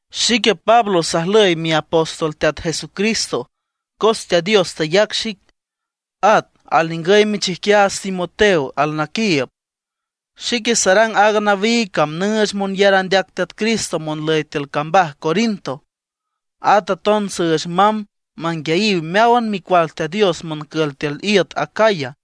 Xique Pablo sajlüy miapóstol Teat Jesucristo cos Teat Dios tayac xic. At alningüy michijquiaats Timoteo alnaquiiüb. Xique sarang aaga nawiig cam nüüch monyar andeac Teat Cristo monlüy tiül cambaj Corinto. At aton süüch mamb manguiayiw meáwan micual Teat Dios moncül tiül iüt Acaya.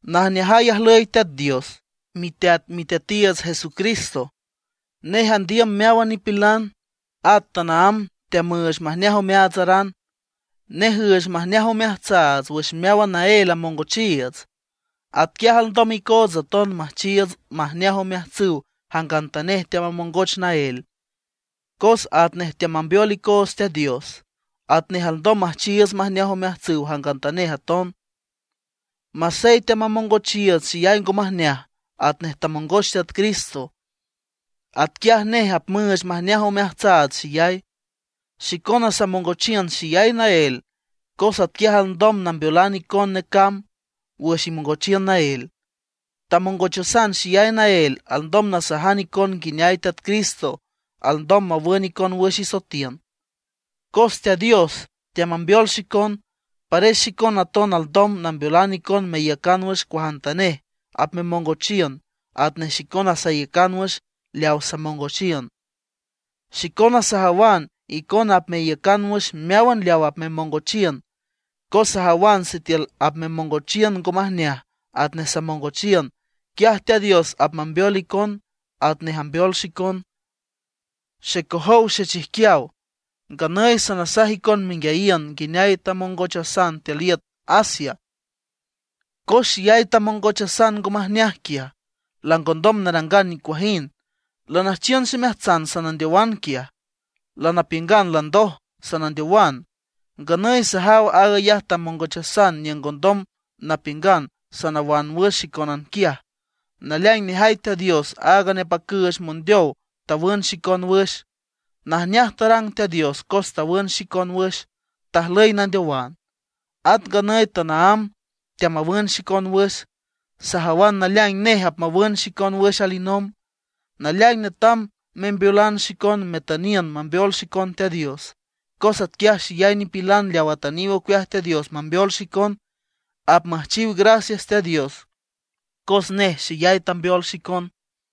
Najneajay ajlüy Teat Dios, miteat Miteatiiüts Jesucristo. Nej andiüm meáwan nipilan, at tanaámb teamüüch majneaj omeaatsaran. Nej üüch majneaj omeajtsaats wüx meáwan naél amongochiiüts. Atquiaj alndom icootsa aton müjchiiüts majneaj omeajtsüw jangantanej teamamongoch naél. Cos atnej teambeol icoots Teat Dios, atnej alndom müjchiiüts majneaj omeajtsüw jangantanej aton. Masey teamamongochiiüts xeyay ngo majneaj atnej tamongoch Teat Cristo, atquiaj nej apmüüch majneaj omeajtsaats xeyay. Xicona samongochiün xeyay naél cos atquiaj alndom nambeolan icon necamb wüx imongochiün naél. Tamongochasan xeyay naél alndom nasajan icon nguineay Teat Cristo alndom mawün icon wüx isoetiün. Cos Teat Dios teamambeol xicon, pares xicona aton alndom nambeolan icon meiücan wüx cuajantanej apmemongochiün atnej xicona saiücan wüx leaw samongochiün. Xicona sajawan icona apmeiücan wüx meáwan leaw apmemongochiün, cos sajawan sitiül apmemongochiün ngo majneaj atnej samongochiün, quiaj Teat Dios apmambeol icon atnej ambeol xicon. Xecojow xechijquiaw, nganüy sanasaj icon menguiayiün nguineay tamongochasan tiül iüt Asia. Cos xeyay tamongochasan ngo majneaj quiaj, langondom narangan nicuajind, lanüjchiün ximeajtsan sanandeowan quiaj. Lanapiüngan landoj, sanandeowan. Nganüy sajaw aag ayaj tamongochasan niüng ngondom napiüngan sanawan wüx xicónan quiaj. Naleaing nejay Teat Dios áag nepacüüch mondeow tawün xicon wüx. Najneaj tarang Teat Dios cos tawün xicon wüx, tajlüy nandeowan; at nganüy tanaámb teamawün xicon wüx. Sajawan naleaing nej apmawün xicon wüx alinomb. Naleaing netam membeolan xicon metüniün mambeol xicon Teat Dios. Cos atquiaj xeyay nipilan leaw atüniw ocueaj Teat Dios mambeol xicon, apmüjchiw gracias Teat Dios cos nej xeyay tambeol xicon.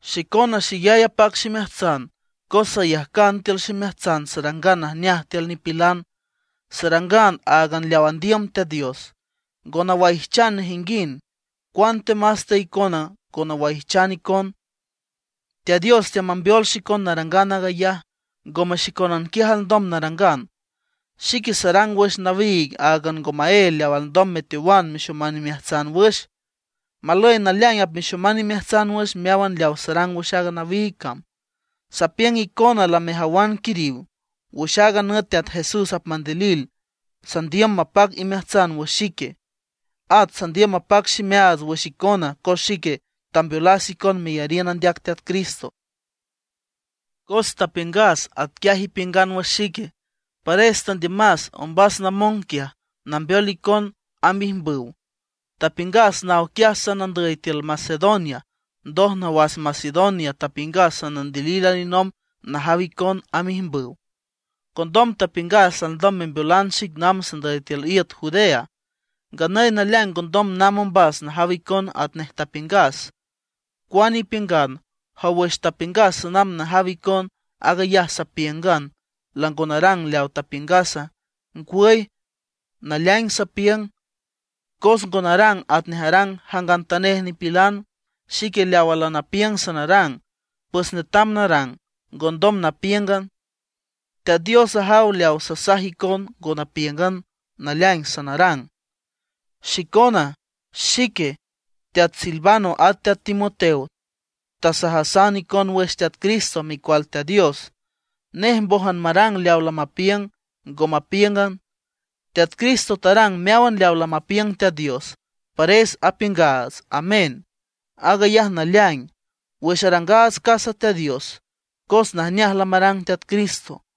Xicona xeyay apac ximeajtsan cos sayajcan tiül ximeajtsan sarangan najneaj tiül nipilan, sarangan áagan leaw andiüm Teat Dios; ngo nawaijchan nejinguind, cuantemas te icona ngo nawaijchan icon. Teat Dios teamambeol xicon narangan aag ayaj, ngome xicónan quiaj alndom narangan. Xique sarang wüx nawiig áagan ngo maél leaw alndom meteowan mexoman imeajtsan wüx. Malüy naleaing apmexoman imeajtsan wüx meáwan leaw sarang wüx aaga nawiig cam. Sapiüng icona lamejawan quiriw. Wüx aaga nüt Teat Jesús apmandilil sandiüm mapac imeajtsan wüx xique; at sandiüm mapac ximeaats wüx icona cos xique tambeolas icon meyariün andeac Teat Cristo. Cos tapiüngas atquiaj ipiüngan wüx xique; pares tandiümas ombas namong quiaj, nambeol icon amb ijmbüw. Tapiüngas naw quiaj sanandüy tiül Macedonia, ndoj nawas Macedonia tapiüngas sanandilil alinomb najaw icon amb ijmbüw. Condom tapiüngas alndom membeolan xic namb sandüy tiül iüt Judea. Nganüy naleaing ngondom namb ombas najaw icon atnej tapiüngas. Cuane ipiüngan, ¿jow wüx tapiüngas sanamb najaw icon, aag ayaj sapíüngan, lango narang leaw tapiüngasa? Ngwüy, naleaing sapiüng, cos ngo narang atnej arang jangantanej nipilan. Xique leawa lanapiüng sanarang, pues netam narang, ngondom napíüngan. Teat Dios ajaw leaw sasaj icon ngo napíüngan, naleaing sanarang. Xicona, xique, teat Silvano at teat Timoteo tasajasan icon wüx Teat Cristo, Micual Teat Dios. Nej mbójan marang leaw lamapiüng, ngo mapíüngan. Teat Cristo tarang meáwan leaw lamapiüng Teat Dios, pares apiüngaats “Amén, aag ayaj naleaing” wüx arangaats casa Teat Dios, cos najneaj lamarang Teat Cristo.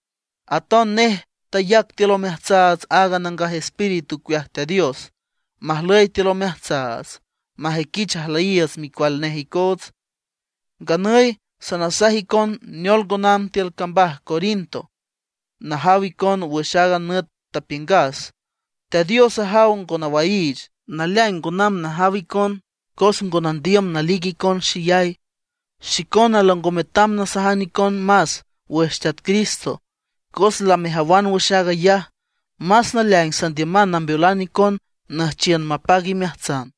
Aton nej tayac tiül omeajtsaats aaga Nangaj Espíritu ocueaj Teat Dios, majlüy tiül omeajtsaats, majüiquich ajlüyiiüts micual nej icoots. Nganüy sanasaj icon neol ngo namb tiül cambaj Corinto najaw icon wüx aaga nüt tapiüngas. Teat Dios ajaw ngo nawaiich. Naleaing ngo namb najaw icon cos ngo nandiüm nalic icon xeyay. Xicona lango metam nasajan icon más wüx Teat Cristo cos lamejawan wüx aag ayaj. Más naleaing, sandiüman nambeolan icon nüjchiün mapac imeajtsan.